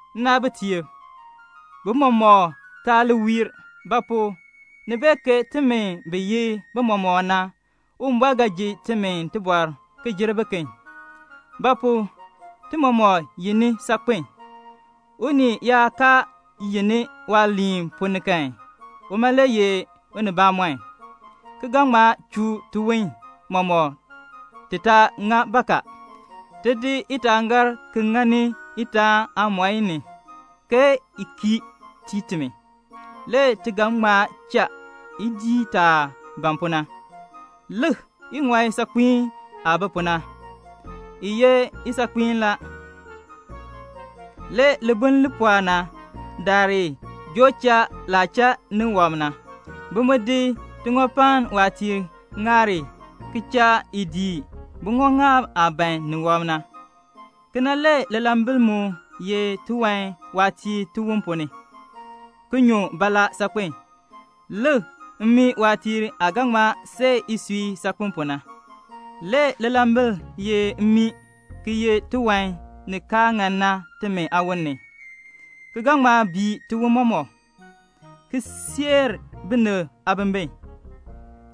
Nnaabitiib, bimɔmɔkb taa li wiir; ba pu? ni bee ke timi bi ye bimɔmɔkb na, Uwumbɔr ga ji timi tibɔr ki jer biken. Ba pu? ti mɔmɔk yenni saakpen. Unii yaa kaa yenni waaliin ponn ni kan, uma le ye unibamɔnn, ki ga ŋma chuu tiwon mɔmɔk ti taa ŋa bakaa. Ti di itaangaar ki ŋani itaan aamɔi ni, i kii tii timi. Le ti ga ŋma cha i dii taah ban pu na. Lik iŋɔi saakpiin aah bi pu na. I ye isaakpiin la. Le libuln li pɔɔ na daar i joo cha laah cha ni wɔb na. Bi mu di tiŋɔpann waatiir ki cha i dii buŋɔŋaab aah ban ni wɔb na. Kena le lilambil mu ye tiwan waatiir tiwon ponn ni, ki nyu baalaa saakpen. Lik, mmii waatiir aah ga ŋma see isui saakpen pu na. Le lilambil ye mmii ki ye tiwan ni kaa ŋan na timi aawon ni, ki ga ŋma bii tiwon mɔmɔk, ki seer binib aabimbin.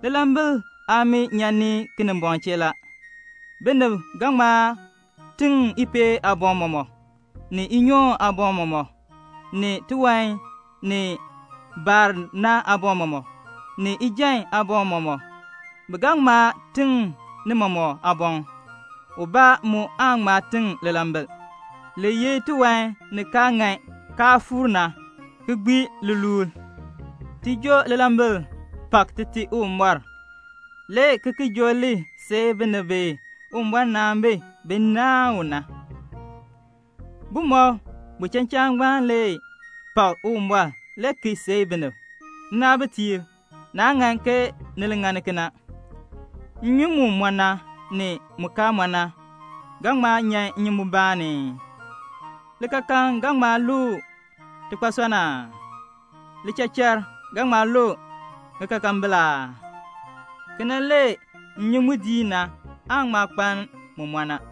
Lilambil aamii nyan ni Kinimbɔŋ chee la. Binib ga ŋma tiŋ ipeel aaboŋ mɔmɔk, ni inyoon aaboŋ mɔmɔk, ni tiwan ni baar na aaboŋ mɔmɔk, ni ijan aaboŋ mɔmɔk. Bi ga ŋma tiŋ ni mɔmɔk aaboŋ. Ubaa mu aan ŋma tiŋ lilambil. Li ye tiwan ni kaa ŋan kaa fuur na, ki gbii liluul. Ti di lilambil ki pak Tite Uwumbɔr, le ki seei binib bi Uwumbɔr naan bi, bin naahn u na. Bumɔb buchachaan ngbaan le pak Uwumbɔr le ki seei binib. Nnaabitiib, naa ŋan ke ni li ŋani kena. Nnyun mu mɔ na, ni mu kaa mɔ na, ga ŋma nyan nnyumbun mubaa ni ii? Likaakaln ga ŋma lu tikpasɔnn aa? Lichachar ga ŋma lu ŋikaakambil aa? Kena le nnyun mu diin na aa ŋma kpaln mu mɔ na.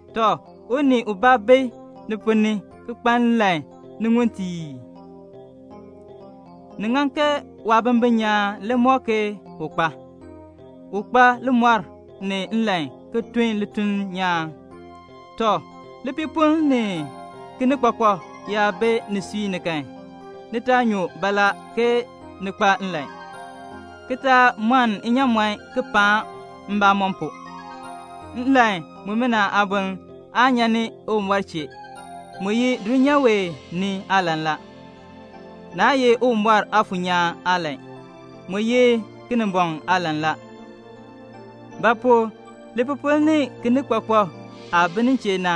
Tɔ, unii ubaa bi ni ponn ni ki kpa nlan ni mbeen aa? Ni ŋan ke waabimbin nyaan le mɔk ke u kpa. U li kpa limɔr ni nlan ki tun lituln nyaan. Tɔ, lipiipoln ni kinikpakpak yaa bi nisui ni kan, ni taa nyun baalaa ke ni kpa nlan, ki taa mɔn nnyaamɔn ki paan mbamɔn pu. Nlan mumina aaboln aa nyan ni Uwumbɔr chee. Mu ye dulnyaa wee ni aalan la. Naa ye Uwumbɔr Aafuur nyaan aalan. Mu ye Kinimbɔŋ aalan la. Ba pu? lipiipoln ni kinikpakpak aah bi nin chee na,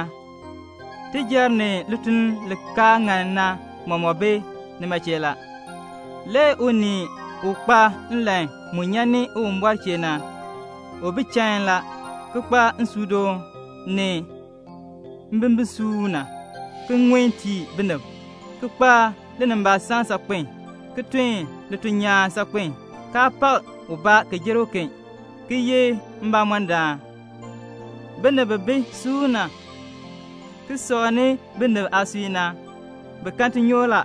tijar ni lituln li kaa ŋan na mɔmɔk bi nima chee la. Le unii u kpa nlan mu nyan ni Uwumbɔr chee na, u bi chain la, ki kpa nsuudoon, ni mbimbisuuna, ki ŋun tii binib, ki kpa linimbaasaln saakpen, ki tun lituln nyaan saakpen, kaa pak ubaa ki jer uken, ki ye mbamɔndaan. Binib bi bi suuna ki sɔŋni binib aasui na, bi kan tinyoor la.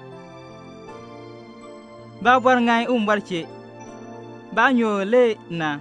Baabɔr ŋan Uwumbɔr chee. Baanyoor le na.